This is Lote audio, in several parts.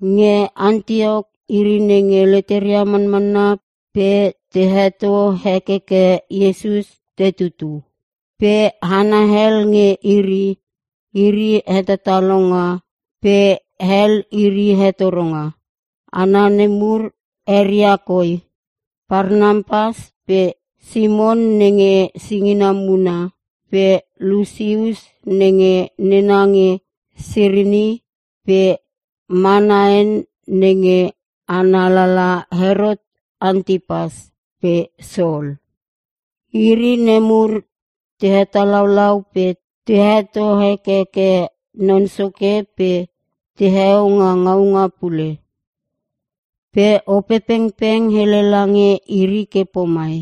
Nge Antiok, iri nenge leteria manmanna pe te heto hekeke Iesus te tutu. Pe hana hel nge iri, iri hetatalonga. Pe hel iri hetoronga. Hana nemur eria koi; Parnapas pe Simon (nenge singina muna) pe Lusius (nenge nena nge Sirini) pe Manaen (nenge ana lala Herot Antipas) pe Sol. Iri nemur te hetalaulau pe te heto hekeke Non Soke pe teheo nga ngaunga pule. Pe Opepengpeng hele lange iri ke pomai,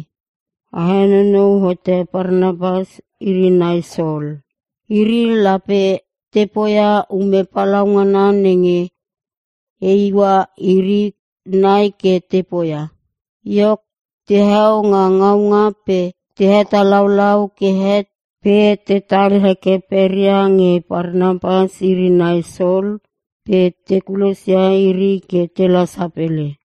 “A henonou hote Parnapas iri nai Sol. Iri lape te poia ume palaungana nenge e iua iri nai ke te poia.” Iok, teheo nga ngaunga pe te hetalaulau ke het pe tetal heke peria nge Parnapas iri nai Sol pe te kulosia iri ke tela sapele.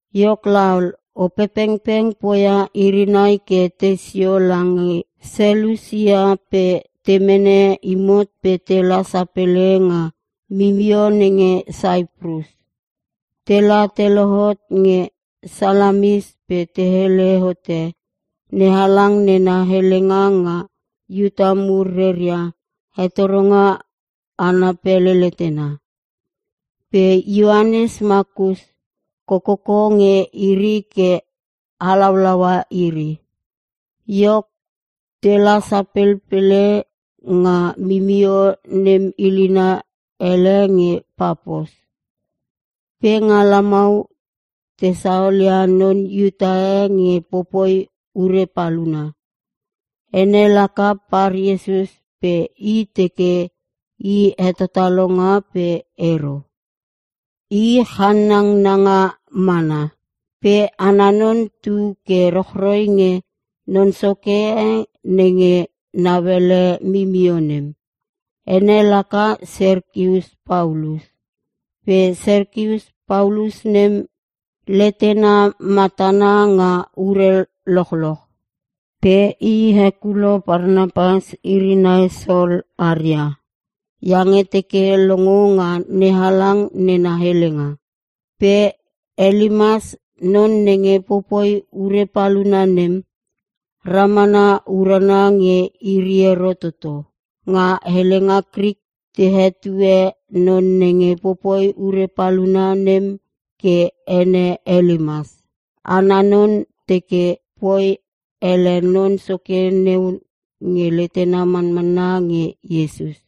Iok laol, Opepengpeng poia iri nai ke tei sio lange Selusia pe te mene imot pe tela sapele nga mimio nenge Saiprus. Tela te lohot nge Salamis pe te hele hote NeHalang nena helenga nga Iuta mur reria hetoronga ana pele letena. Pe Ioanes Makus, kokoko nge iri ke halaulaua iri. Iok, tela sapelpele nga mimio nem ilina ele nge Papos. Pe nga lamau, te saolia non Iuta e nge popoi ure paluna. Ene laka Par-Iesus pe i teke i hetatalonga pe ero. I chanangnanga mana. Pe ana non tu ke rochroi nge non soke e nenge nauele mimio nem, ene laka Serkius Paulus. Pe Serkius Paulus nem, letena matana nga ure lochoch. Pe i hekulo Parnapas iri nai Sol aria, iange teke longo nga NeHalang nena helenga. Pe Elimas non nenge popoi ure paluna nem, ramana urana nge iri ero toto. (Nga helenga Krik, te hetue non nenge popoi ure paluna nem ke ene Elimas) Ana non teke poi ele non soke neu nge letena manmanna nge Iesus.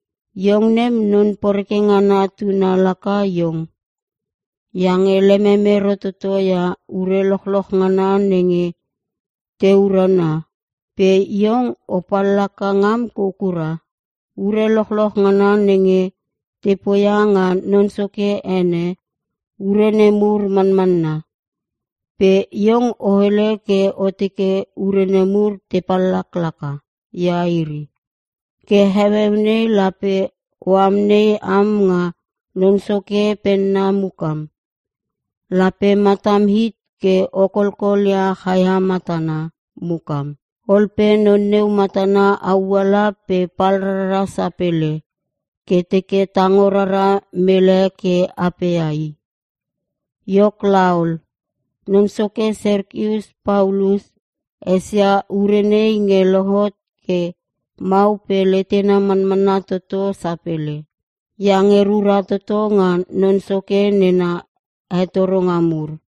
“Iong nem, Non poreke ngana tuna laka iong! Iange lemem ero toto ia ure lochloch ngana nenge te urana! Pe iong, o pallaka ngam kou kura. Ure lochloch ngana nenge te poia nga Non Soke ene, ure nemur manmanna. Pe iong, o hele ke o teke ure nemur te pallaklaka ia iri. Ke heueu nei lape o amnei am nga Non Soke penna mukam. Lape matam hit ke o kolkol ia chaia matana mukam.” Ol pe non neu matana auala pe pal rara sapele, ke teke tango rara mele ke apea i. Iok laol, non soke Serkius Paulus esia ure nei nge lohot ke mau pe letena manmanna toto sapele. Iange rura toto nga Non Soke nena hetoronga mur.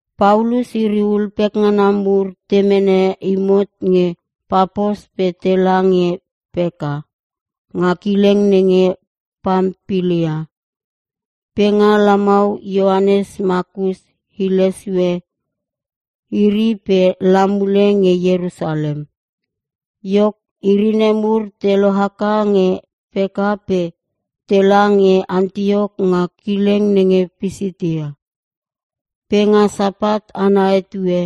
Paulus iri ul pekngana mur te mene imot nge Papos pe tela nge Perka, nga kileng nenge Pampilia. Pe nga lamau Ioanes Makus hile sue iri pe la mule nge Ierusalem. Iok, iri nemur te lohaka nge Perka pe tela nge Antiok nga kileng nenge Pisitia. Pe nga Sapat ana etue,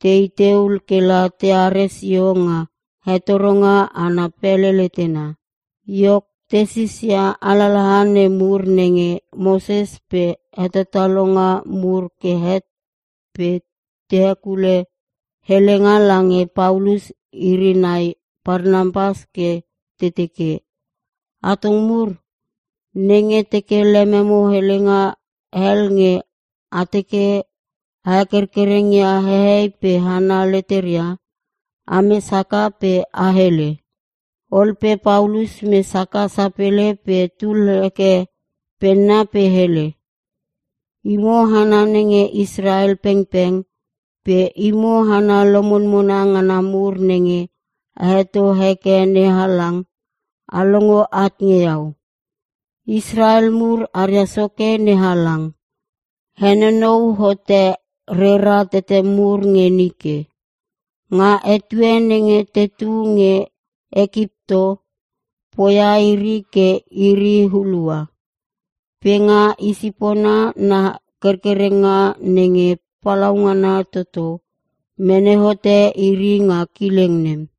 tei teu kela teare sio nga hetoronga ana pele letena. Iok, te sisia alalaha nemur nenge Moses pe hetatalonga mur ke het pe te hekule helenga lange Paulus iri nai Parnapas ke te teke, “Atong mur, nenge teke lemo helenga hel nge a teke a hekerkereng ia hehei pe hana leteria, ames haka pe a hele.” Ol pe Paulus mes haka sapele pe tul heke penna pe hele, “Imo hana nenge Israel pengpeng pe imo hana lomonmona ngana mur nenge a heto heke NeHalang, a longo at nge iau. Israel mur aria soke NeHalang, henonou hote rera tete mur nge nike. Nga etue nenge tetu nge Ekipto, poia iri ke iri hulua. Pe nga i sipona na kerkerenga nenge palaungana toto, mene hote iri nga kileng nem.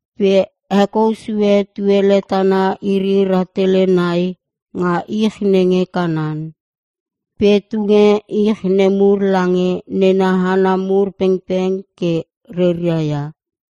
Pe hekou sue tuele tana iri rahtele nai nga ich nenge Kanan. Pe tunge ich nemur lange nena hana mur pengpeng ke reria ia.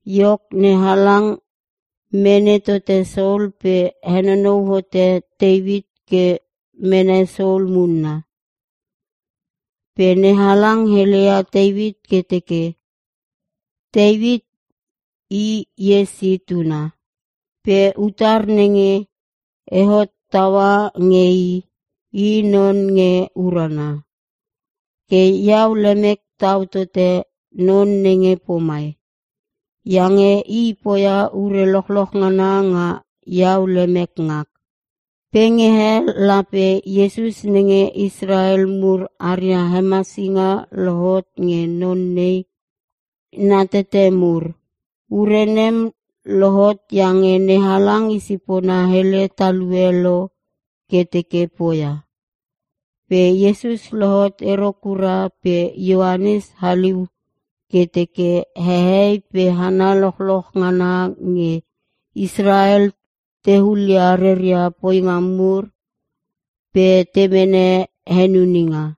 Iok, NeHalang mene tote Sol pe henonou hote Teuit ke mene Sol munna. Pe NeHalang heleia Teuit ke teke, ‘Teuit i Iesi tuna. Pe utar nenge e hottaua nge i, i non nge urana. Ke iau lemek tau tote non nenge pomai. Iange i poia ure lochloch ngana nga iau lemek ngak.’ “Pe nge he, lape Iesus nenge Israel mur aria hemasinga lohot nge non nei na tete mur. Ure nem lohot iange NeHalang i sipona hele talue lo ke teke poia. Pe Iesus lohot ero kura pe Ioanes haliu ke teke hehei pe hana lochloch ngana nge Israel te hulia reria poinga mur pe te mene henuninga.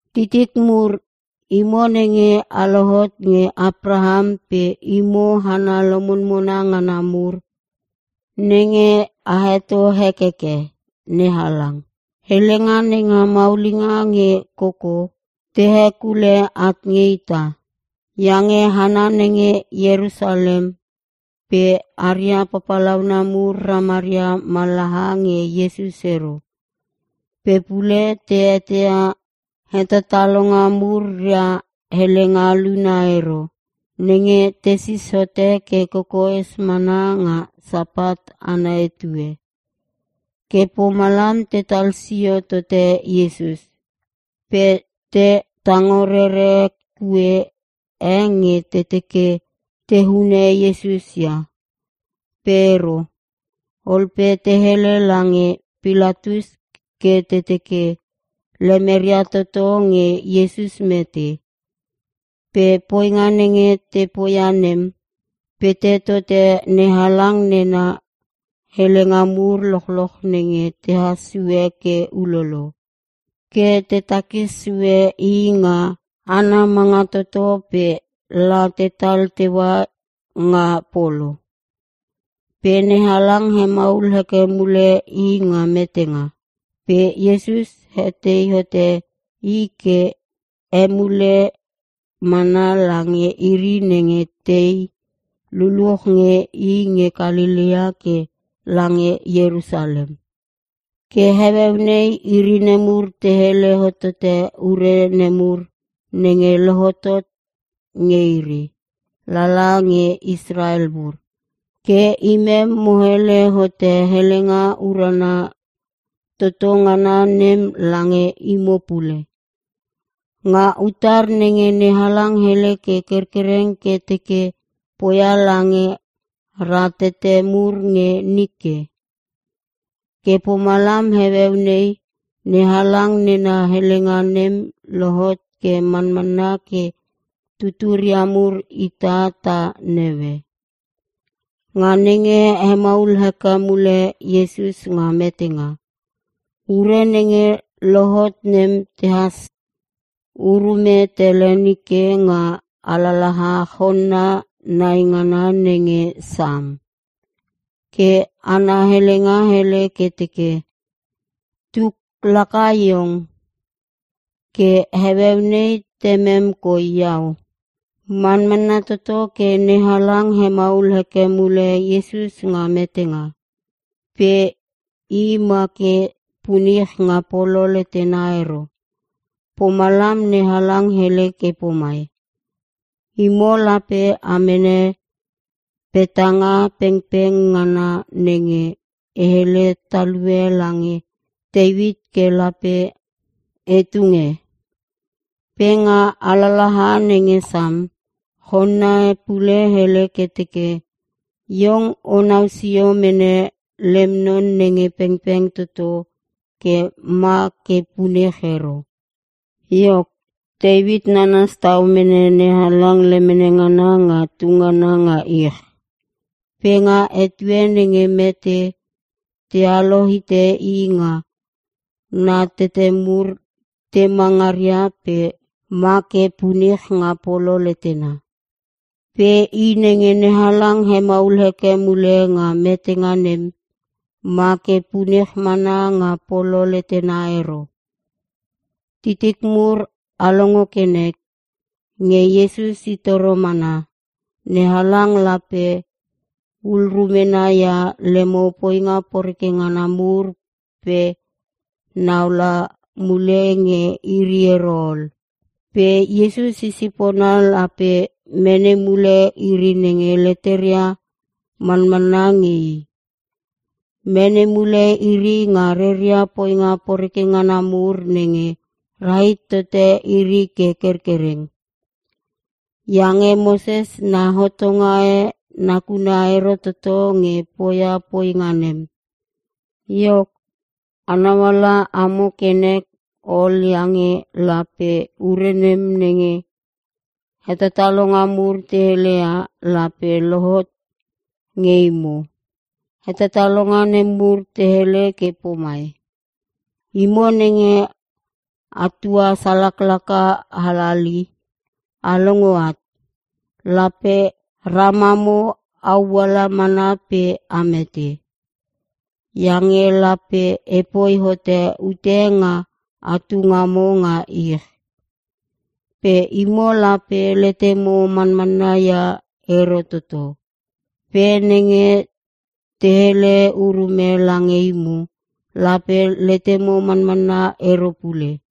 “Titik mur, imo nenge a lohot nge Apraham pe imo hana lomonmona ngana mur nenge a heto hekeke NeHalang, helenga nenga maulinga nge koko, te hekule at nge ita. Iange hana nenge Iersalem pe aria papalauna mur ramaria mallaha nge Iesus ero. Pe pule te eteia hetatalonga mur ria helenga luna ero, nenge tesis hote ke kokoes mana nga Sapat ana etue. Ke pomalam tetal sio tote Iesus. Pe te tango rere kue e nge te teke te hune Iesus ia. Pe ero. Ol pe te hele lange Pilatus ke te teke, lemeria toto nge Iesus mete. Pe poinga nenge te poia nem, pete tote NeHalang nena helenga mur lochloch nenge tehas sue ke ulolo. Ke te takis sue i nga ana manga toto pe la tetal teua nga polo. Pe NeHalang hemaul heke mule i nga metenga. Pe Iesus hetei hote i ke emule mana lange iri nenge tei luluch nge i nge Kalelea ke lange Ierusalem. Ke heueu nei, iri nemur te hele hotote ure nemur nenge lohotot nge iri, lala nge Israel mur. Ke imem mo hele hote helenga urana toto ngana nem lange imo pule. Nga utar nenge NeHalang hele ke kerkereng ke teke poia lange ratete mur nge nike. Ke pomalam heueu nei, NeHalang nena helenga nem lohot ke manmanna ke tuturia mur ita ta naue. Nga nenge hemaul heke mule Iesus nga metenga, ure nenge lohot nem tehas urume tele nike nga alalaha chonna naingana nenge Sam. Ke ana helenga hele ke teke, “‘Tuk laka Iong; ke heueu nei Temem koi Iau’” Manmanna toto ke NeHalang hemaul heke mule Iesus nga metenga. Pe i ma ke punich nga polo letena ero. Pomalam, NeHalang hele ke pomai, “‘Imo lape a mene petanga pengpeng ngana nenge e hele talue lange Teuit ke lape e tunge.’ Pe nga alalaha nenge Sam, chonna e pule hele ke teke, ‘Iong onau sio mene lem non nenge pengpeng toto ke ma ke punich ero.’ “Iok, Teuit nanas tau mene NeHalang lemene ngana nga tungana nga ich. Pe nga etue nenge mete, tealo hite i nga na tete mur tema ngaria pe make punich nga polo letena. Pe i nenge NeHalang hemaul heke mule nga metenga nem, ma ke punich mana nga polo letena ero. Titik mur a longo ke nek, nge Iesus i toro mana, NeHalang lape ul rumena ia lemo poinga poreke ngana mur pe nau la mule nge iri ero ol. Pe Iesus, i sipona lape mene mule iri nenge leteria manmanna nge i. Mene mule iri nga reria poinga poreke ngana mur nenge rahit tote iri ke kerkereng. Iange Moses na hotonga e nakuna ero toto nge poia poinga nem. Iok, a nauala amo ke nek ol iange lape ure nem nenge hetatalonga mur te heleia, lape lohot nge imo. Hetatalonga nemur te hele ke pomai, “‘Imo nenge a tua salaklaka halali, a longo at. Lape ramamo auala mana pe a mete. Iange lape epoi hote ute nga atu ngamo nga ich. Pe imo lape letemo manmanna ia ero toto. Pe nenge te hele urume lange imo, lape letemo manmanna ero pule.’”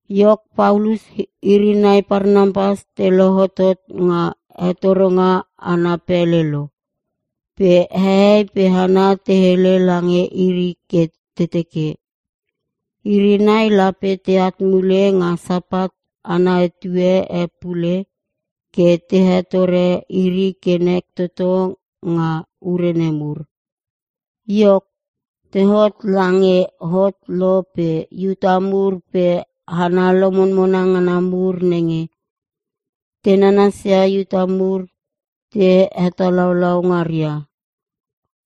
Iok, Paulus iri nai Parnapas te lohotot nga hetoronga ana pele lo, pe hehei pe hana te hele lange iri ke te teke, iri nai lape teat mule nga Sapat ana etue e pule ke te hetore iri ke nek toto nga ure nemur. Iok, tehot lange hot lo pe Iuta mur pe hana lomonmona ngana mur nenge te nanasia Iuta mur te hetalaulau ngaria,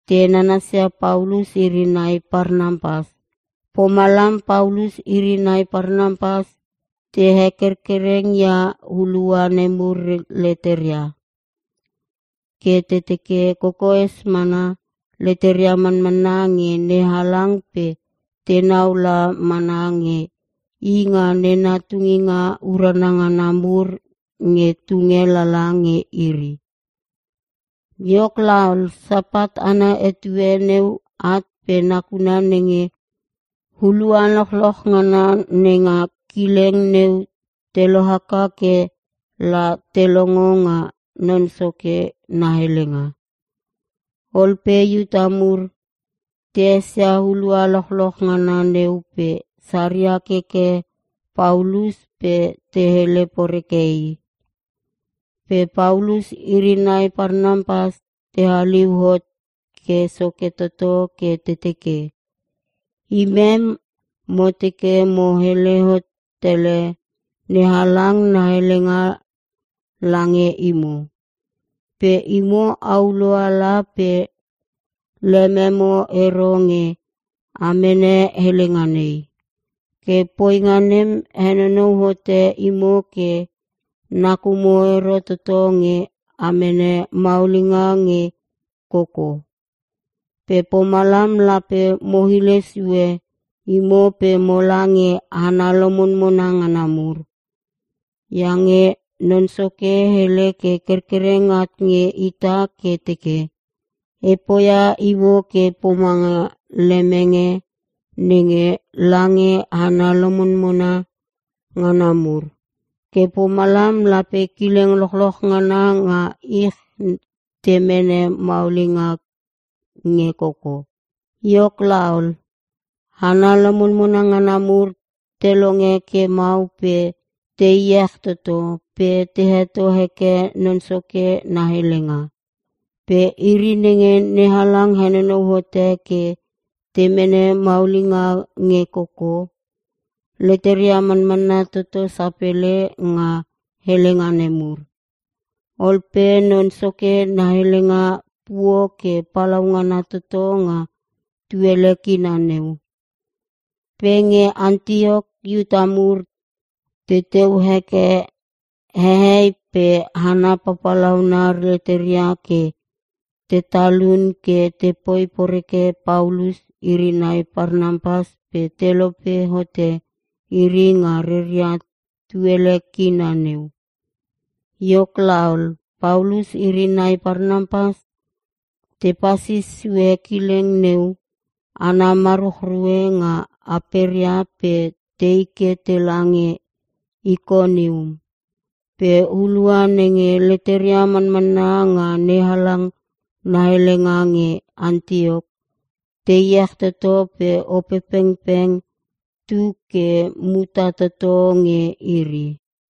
te nanasia Paulus iri nai Parnapas. Pomalam Paulus iri nai Parnapas te hekerkereng ia hulua nemur leteria, ke te teke kokoes mana, leteria manmanna nge NeHalang pe tenau la mana nge i nga nena tunginga urana ngana mur nge tunge lala nge iri. Iok laol, Sapat ana etue neu at pe nakuna nenge hulua lochloch ngana nenga kileng neu te lohaka ke la te longo nga Non Soke na helenga. Ol pe Iuta mur, te esia hulua lochloch ngana neu pe saria keke Paulus pe te hele poreke i. Pe Paulus iri nai Parnapas te haliu hot ke soke toto ke te teke, “Imem mo teke mo hele hot tele NeHalang na helenga lange imo. Pe imo, aulo ala pe lememo ero nge a mene helenga nei. Ke poinga nem henonou hote imo ke nakumo ero toto nge a mene maulinga nge koko. Pe pomalam lape mo hile sue imo pe mola nge hana lomonmona ngana mur. Iange Non Soke hele ke kerkereng at nge ita ke teke, “‘E poia imo ke pomanga lemenge nenge lange hana lomonmona ngana mur. Ke pomalam lape kileng lochloch ngana nga ich te mene maulinga nge koko.’” Iok laol, hana lomonmona ngana mur te longe ke mau pe te iech toto, pe te heto heke Non Soke na helenga. Pe iri nenge NeHalang henonou hote ke te mene maulinga nge koko, leteria manmanna toto sapele nga helenga nemur. Ol pe Non Soke na helenga puo ke palaungana toto nga tuele kina neu. Pe nge Antiok, Iuta mur teteu heke hehei pe hana papalauna leteria ke te talun ke tepoi poreke Paulus iri nai Parnapas pe telope hote iri nga reria tuele kina neu. Iok laol, Paulus iri nai Parnapas tepasis sue kileng neu ana maruchrue nga aperia pe tei ke tela nge Ikonium. Pe hulua nenge leteria manmanna nga NeHalang na helenga nge Antiok, te iech toto pe Opepengpeng tu ke muta toto nge iri.